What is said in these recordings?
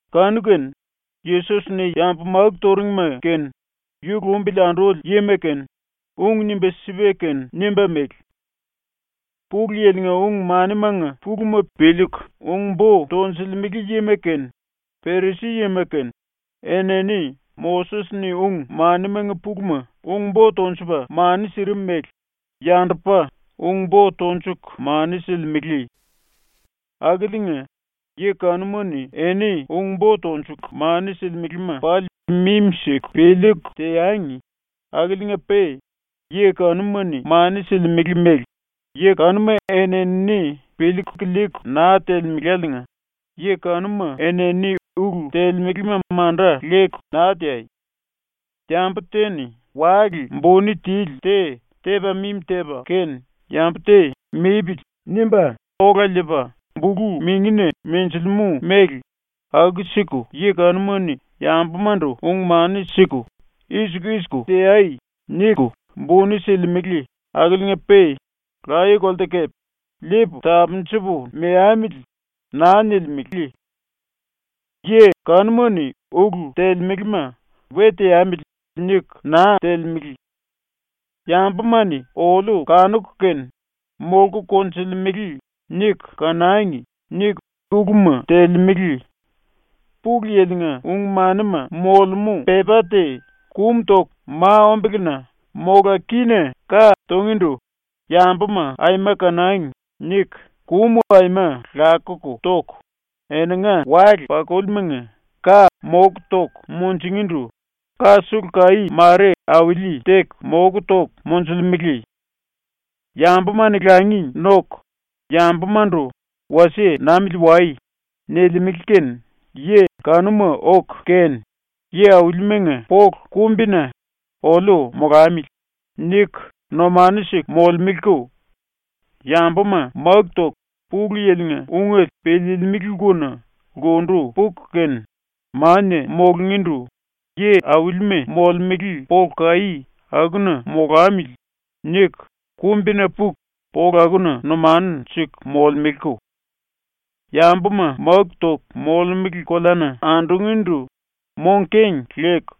Kanu-kene Yesos-ni yambu máku turingima kene, yu lumbili anduli yima kene, ung nimba sipa kene nimba mele: “Pulu Yili-nga ung-manimanga puluma piliiku ung-bo tonjilimele yima kene, Perisi-yima kene, enini Moses-ni ung-manimanga puluma ung-bo tonjupa mani sirim mele yandupa ung-bo tonjuku mani silimele. Akiliinga, yi kanuma-ni eni ung-bo tonjuku mani silimelema pali mimi-siku piliiku teangi, akiliinga-pe yi kanuma-ni mani silimele mele yi kanuma eni-enini piliiku liiku naa telemeláliinga yi kanuma enini ulu telemelema manda leku naa teai. Yambu te-ni wale buni tili te tepa mimi tepa kene yambu te ‘mipili.’ nimba ola liipa bulu-mingina menjilimú mele ⸤aku-siku yi kanuma-ni yambumandu ung-mani siku “I-siku i-siku teai.” niku⸥ buni silimele akiliinga-pe laye-kolte kepe ‘Liipu tapunjupu meamili.’ naa nilimele. “Yi kanuma-ni ulu telemelema ‘we teamili.’ niku naa telemele. ‘Yambuma-ni oliu kanuku kene ‘molku konjulemele.’ niku kanangi.’ niku uluma telemele. Pulu Yili-nga ung-manima molemú pepá te kumu toku mai-ombelena mola kína ka tungíndu ‘Yambuma aima kanangi.’ niku kumu aima lakuku toku, eninga wale-pakulimanga ka moku toku munjingíndu ka sulu kaí mare auli-teku moku toku monjulemele. Yambuma-ni langi noku yambumandu “Wasie namili wai.” nilimele kene yi kanuma oku kene yi-aulimanga polu kumbina ‘oliu molamili.’ niku numanu siku molemeleko. Yambuma máku toku Pulu Yili-nga ungele piliilimili lkuna lkundu puku kene mania mulungíndu yi-aulima molemele polu kaí akuna ‘molamili.’ niku kumbina puku polu akuna numanu siku molemeleko. Yambuma máku toku molemele koleana andungíndu mong-keng leku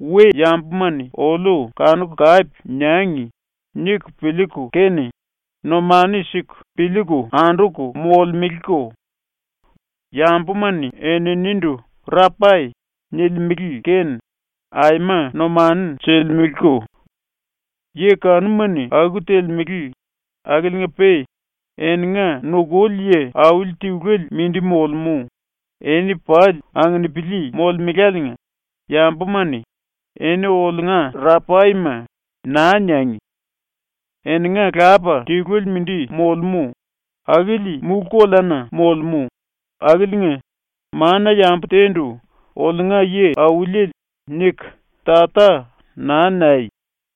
‘We-yambuma-ni oliu kanuku kape niangi.’ niku piliiku kene numanu siku piliiku anduku molemeleko. Yambuma-ni eninindu ‘Rapai’ nilimele kene aima numanu silimeleko. “⸤Yi kanuma-ni aku telemele⸥ akiliinga-pe eninga nukuli yi auli tiluele mindi molemú, eni pali anginipili molemeláliinga yambuma-ni “eni oliunga Rapaima.” naa niangi. Eninga Lapa tiluele mindi molemú, akili mulú-koleana molemú, akiliinga mana-yambu te-ndu ⸤‘oliunga yi-auliele’ niku⸥ “Tata” naa niai.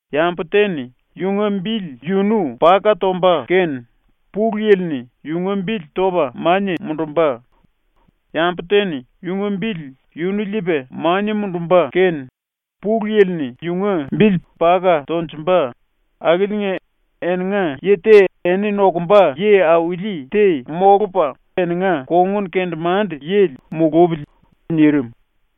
Yambu te-ni yunga bili yunu paka tomba kene ⸤Pulu Yili-ni⸥ yunga bili topa mania mundumba; yambu te-ni yunga bili yunu liipa mania mundumba kene ⸤Pulu Yili-ni⸥ yunga bili paka tonjumba akiliinga eninga yi te eni nokumba yi-auli te molupa eninga kongun-kendemande-yili mulupili.” ⸤nirim.⸥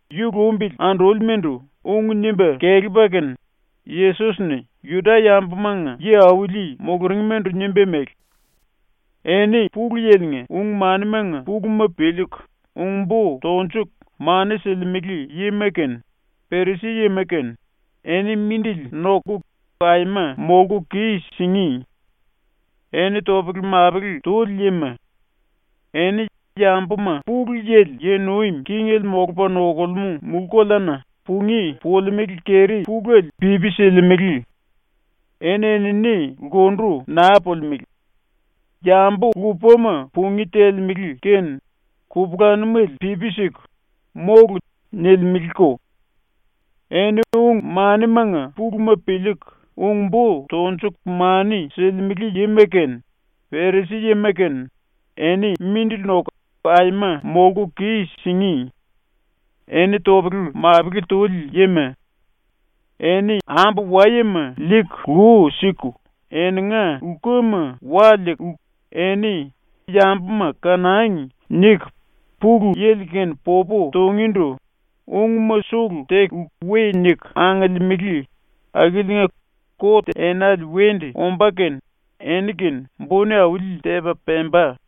⸤Yu lumbili andúlimandu ung nimba kelepa kene Yesos-ni Juda-yambumanga yi-auli muluringmandu nimba mele⸥: “Eni Pulu Yili-nga ung-manimanga puluma piliiku ung-bo tonjuku mani silimele yima kene, Perisi-yima kene, eni mindili noku aima molku kis-singí! Eni topele-mapele tuli yima! Eni yambuma Pulu Yili yi nuim kingele molupa nokulemú mulú-koleana pungí pulimelé keri-puléle pipi silimele. Eni-enini lkundu naa pulimelé; yambu lupama pungí telemele kene kupulanumele pipi siku “Mólu.” nilimeleko. “(Eni ung-manimanga puluma piliiku ung-bo tonjuku mani silimele yima kene Perisi-yima kene eni mindili noku aima molku kis-singí! Eni topele-mapele tuli yima! Eni ambu-wayema liiku lu siku eninga lkuma wa liiku, eni ‘Yambuma kanangi.’ niku Pulu Yili-kene popu tungíndu ungma sulu teku we niku angiliimili, akiliinga kot enale wendu ombá kene eni-kene buni auli-tepa pemba.)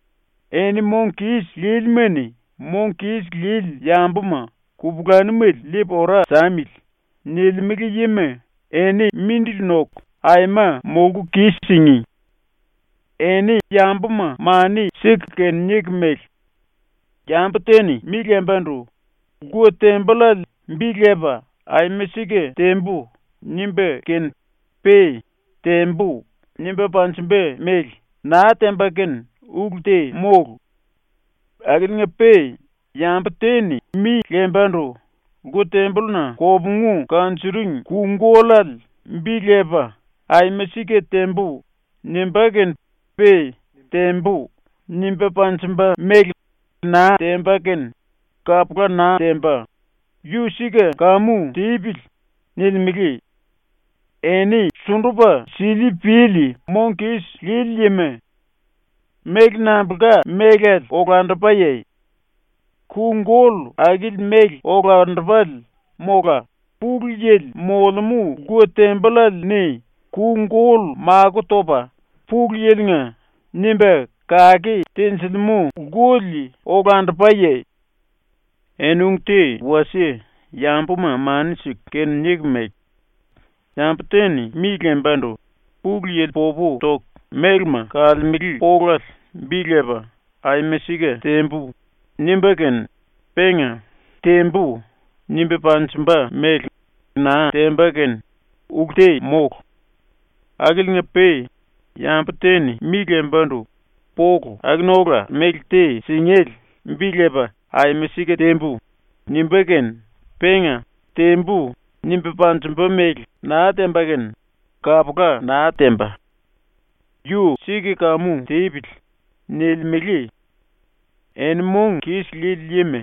“Eni mong kis lílima-ni “⸤Mong kis lili⸥ yambuma kupulanumele liipu ora samili.” nilimele yima eni mindili noku aima molku kis-singí! Eni yambuma mani siku kene niku mele: “Yambu te-ni mi lembandu ‘lku-tembollale’ bi lepa “Aima sika tembu.” nimba kene pe “Tembu.” nimba panjimba mele naa temba kene ulu te mólu. Akiliinga-pe yambu te-ni mi lembandu “lku-tembolluna kopungu kanjuring ku-gollale” bi lepa “Aima sika tembu.” nimba kene pe “Tembu.” nimba panjimba mele naa temba kene kapula naa temba. Yu sika kamu tipili.” nilimele. Eni sundupa sili-pili mong kis lili yima! Méle nambulka mélale olandupaye? Ku-gollu akili méle olandupale mola Pulu Yili molemú lku-tambollale-ni ku-gollu makó topa ‘Pulu Yili-nga’ nimba kake tenjilimú lkuli olandupaye? “Eni ung te wasie yambuma mani siku kene niku mele: “Yambu te-ni mi lembandu ‘Pulu Yili popu toku mélema kalemele polale’ bi lepa “Aima sika tembu.” nimba kene penga “Tembu.” nimba panjimba mele naa temba kene ulu te mólu. Akiliinga-pe yambu te-ni mi lembandu “polu akuna ola méle te singéle” bi lepa “Aima sika tembu.” nimba kene penga “Tembu.” nimba panjimba mele naa temba kene kapula naa temba. Yu sika kamu tipili.” nilimele. Eni mong kis lili yima!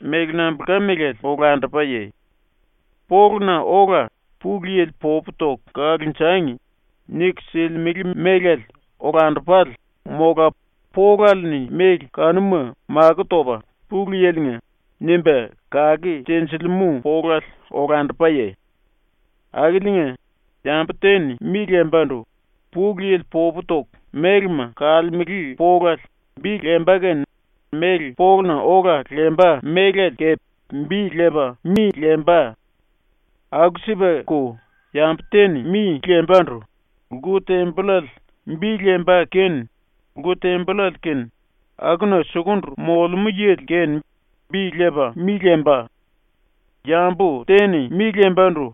Méle nambulka mélale olandupaye? Poluna ola ‘Pulu Yili popu toku kalonjangi.’ niku silimele mélale olandupale mola polale-ni méle kanuma makó topa ‘Pulu Yili-nga’ nimba kake tenjilimú polale olandupaye? “Akiliinga, yambu te-ni mi lembandu ‘Pulu Yili popu toku mélema kalemele polale’ bi lemba kene méle poluna ola lemba mélale kepe bi lepa mi lemba. Aku-sipako yambu te-ni mi lembandu ‘lku-tembollale’ bi lemba kene lku-tembollale kene akuna sukundu molemú yili kene bi lepa mi lemba. Yambu te-ni mi lembandu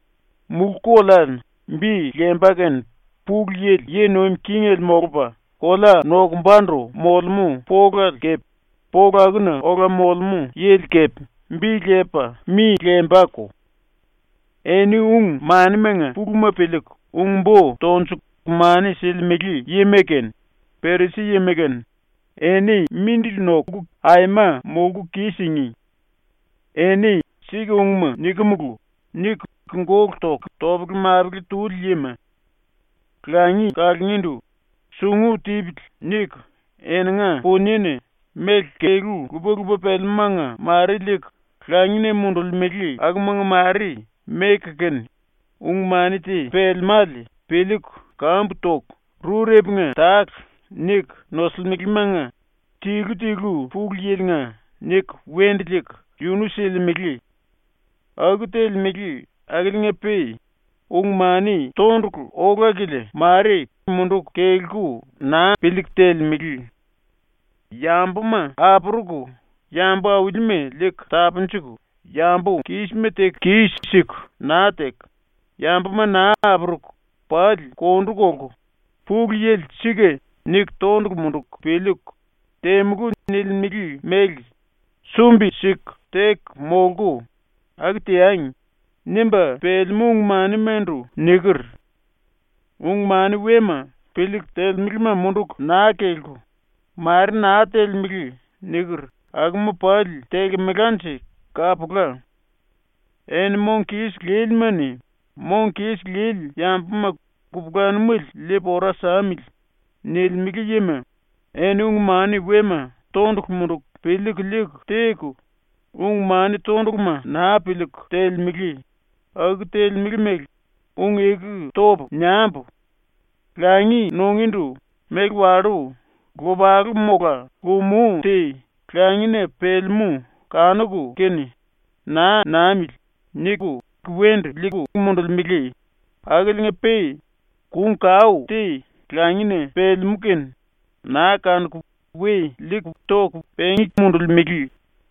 ‘mulú-koleale’ bi lemba kene Pulu Yili yi nuim kingele molupa kolea nokumbandu molemú polale kepe polu akuna ola molemú yili kepe bi lepa mi lembako. “Eni ung-manimanga puluma piliiku ung-bo tonjuku mani silimele yima kene, Perisi-yima kene, eni mindili noku aima molku kis-singí! Eni ‘sika ungma nikimulu.’ niku gólu toku topele-mapele tuli yima! Langi kalungíndu ‘sungu tipili.’ niku eninga puniena méle kelú lupa-lupa pelemúmanga mare liiku langina mundulimele akumanga mare meku kene ung-mani te pelemále piliiku kambu toku “rurepunga tale” niku nosulimelemanga “tilu tilu Pulu Yili-nga” niku wendu liiku yunu silimele. Aku telemele akiliinga-pe ung-mani tondulu ola-kilia mare munduku kelku naa piliiku telemele. ‘Yambuma apuruku yambu-aulima liiku tapunjuku yambu-kísima teku kis-siku naa teku, yambuma naa apuruku pali kondu kolku, Pulu Yili ‘Sika’ niku tondulu munduku piliiku “Temulú.” nilimele mele sumbi-siku teku molku, aku teangi.’ nimba pelemú ung-manimandu niker. Ung-mani wema piliiku telemelema munduku naa kelku ‘mare naa telemele’ niker akuma pali telkemelanje kapula. Eni mong kis lílima-ni “⸤Mong kis lili⸥ yambuma kupulanumele liipu ora samili.” nilimele yima, eni ⸤ung-mani wema tondulu munduku piliiku liiku teku, ung-mani tonduluma naa piliiku telemele, aku telemele mele ung-eku topu niambu:⸥ Langi nungíndu méle wallú lopalu mola lumú te langina pelemú kanuku kene ‘Naa namili.’ niku wendu liiku mundulimele, akiliinga-pe kung-kao te langina pelemú kene naa kanuku we liiku toku pengí mundulimele.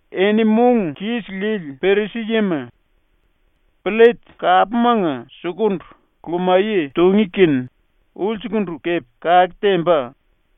Eni mong kis lili Perisi-yima! Pllet kapmanga sukundu lumaye tungí kene ulsukundu kepe kake temba.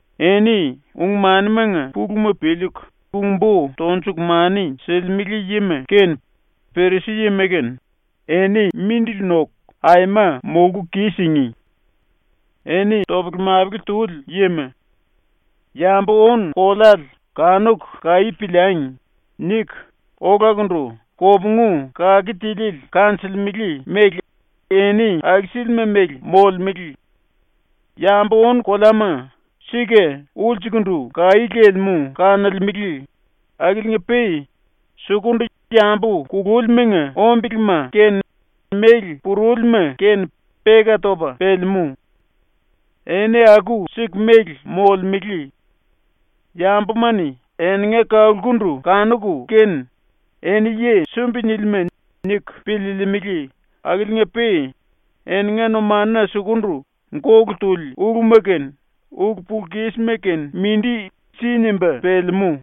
“Eni ung-manimanga puluma piliiku ung-bo tonjuku mani silimele yima kene Perisi-yima kene, eni mindili noku aima molku kis-singí! Eni topele-mapele tuli yima! ‘Yambu-ónu-koleale kanuku kaí piliangi.’ niku olakundu kopungu kake tiliele kanjilimele mele eni aku-sílima mele molemele. Yambu-ónu-koleama sika ulsukundu kaí lelemú kanolemele akiliinga-pe sukundu yambu kulúlimanga ombelema kene méle purúlima kene peka topa pelemú. Eni aku-siku mele molemele. Yambuma-ni eninga kalkundu kanuku kene ‘Eni yi sumbi-nílima’ niku piliilimili akiliinga-pe eninga numanuna sukundu gólu tuli uluma kene ulu-pulu-kísima kene mindi si nimba pelemú.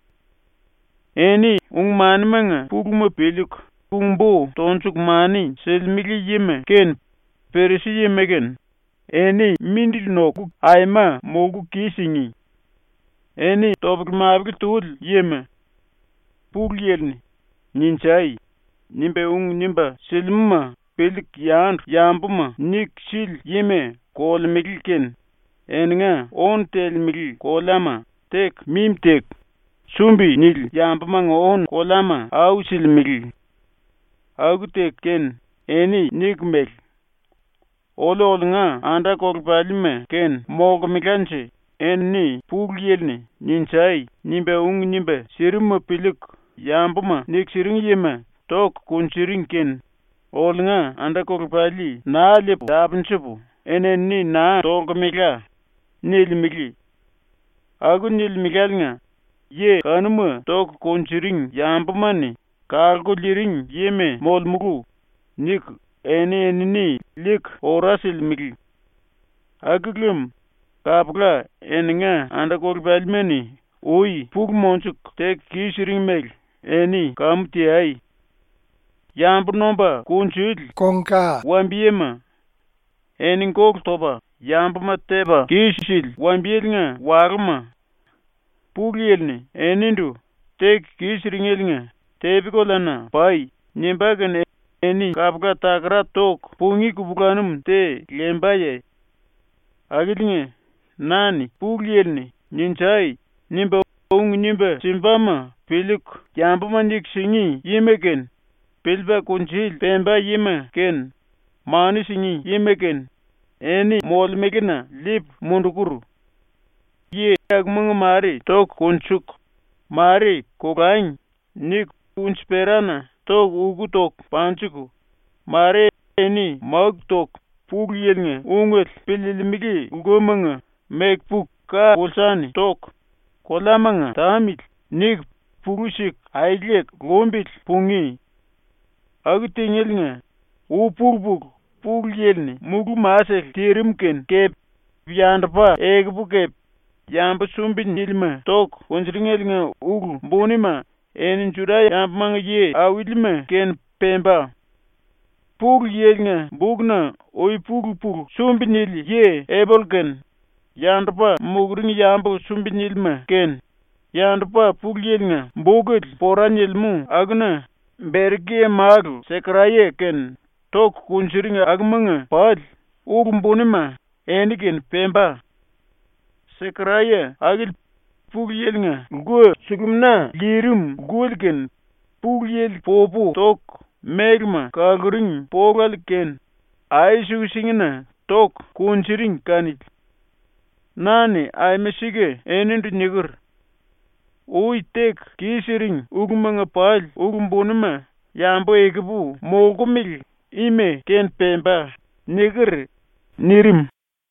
“Eni ung-manimanga puluma piliiku ung-bo tonjuku mani silimele yima kene Perisi-yima kene eni mindili noku aima molku kis-singí! Eni topele-mapele tuli yima! Pulu Yili-ni “Ninjai!” nimba ung nimba silimúma piliiku yandu yambuma niku sili yima kolemele kene eninga ónu telemele koleama teku mimi teku, sumbi-nili yambumanga ónu-koleama au silimele. Aku teku kene eni niku mele: “Oliu oliunga anda-kolepalima-kene molkemelanje enini Pulu Yili-ni “Ninjai!” nimba ung nimba sirimuma piliiku yambuma niku siring yima toku kunjuring kene oliunga anda-kolepali naa liipu tapunjupu enini naa tolkemela.” nilimele. Aku nilimeláliinga ‘Yi kanuma toku kunjuring yambuma-ni kalku liiring yima molemulu.’ niku eni-enini liiku ora silimele. Aku lem kapula eninga anda-kolepalima-ni ui pulu monjuku teku kis-siring mele eni kamu teai. “⸤Yambu nomba kunjuli⸥ wambiyema! Eni gólu topa yambuma tepa kis-sili wambiyelenga walúma! Pulu Yili-ni enindu “Teku kis-siringeliinga tepi-koleana pai.” nimbá kene eni kapula takara toku pungí kupulanum te lembaye? Akiliinga, na-ni Pulu Yili-ni “Ninjai!” nimba ung nimba simbama piliiku yambuma niku singí yima kene, piliipa kungnjuli pemba yima kene, mani singí yima kene, eni molemelena liipu mundukur. Yi akumanga mare toku konjuku, mare ‘kolangi.’ niku unji-perana toku uk toku panjiku, mare eni máku toku Pulu Yili-nga ungele piliilimili lkumanga meku puku ka-pulsa-ni toku, koleamanga ‘tamili.’ niku pulú siku aeleku lumbili pungí. Aku tingéliinga ui-pulu-pulu ⸤Pulu Yili-ni mulú-masele tirim kene⸥ kepe yandupa ekupu kepe yambu sumbi-nílima toku kunjuringeliinga ulu bunima eni ⸤Juda-yambumanga yi-aulima⸥-kene pemba. ⸤Pulu Yili-nga bukna⸥ ui-pulu-pulu sumbi-nili yi Eboll kene, yandupa muluring yambu sumbi-nílima kene, yandupa ⸤Pulu Yili-nga bukele pora nilimú akuna⸥ Berekia-málu Sekaraya kene toku kunjuring akumanga pali ulu-bunima eni-kene pemba. Sekaraya akili Pulu Yili-nga lku-sulumina lirim lkuli kene Pulu Yili popu toku mélema kaluring polale kene ai-suku-singina toku kunjuring kanili. Na-ni aima sika enindu niker: “Ui teku kis-siring ulumanga pali ulu-bunima yambu ekupu molkumele ima-kene pemba.” niker.” ⸤nirim.⸥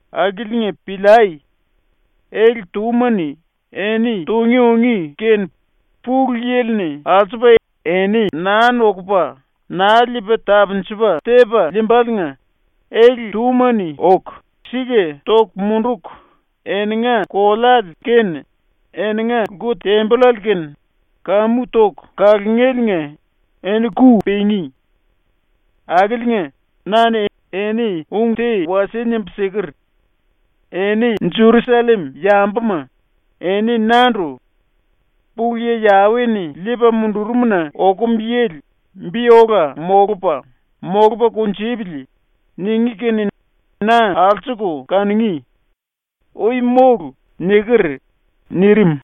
Akiliinga piliai! ⸤Ele-túma-ni eni tungí ungí kene Pulu Yili-ni alsupa eni naa nokupa naa liipa tapunjupa tepa liimbaliinga⸥ ele-túma-ni oku sika toku munduku eninga koleale kene eninga lku-tembollale kene kamu toku kalungéliinga eni ku pingí. Akiliinga na-ni eni ung te wasie nimbu siker: “Eni ⸤Jerusallem-yambuma⸥, eni nandu “Pulu Yi Yawe-ni liipa mundurum-na okum yili bi ola molupa, molupa kunjupili.” ningí kene na alsuku kanungí. Ui mólu.” niker.” nirim.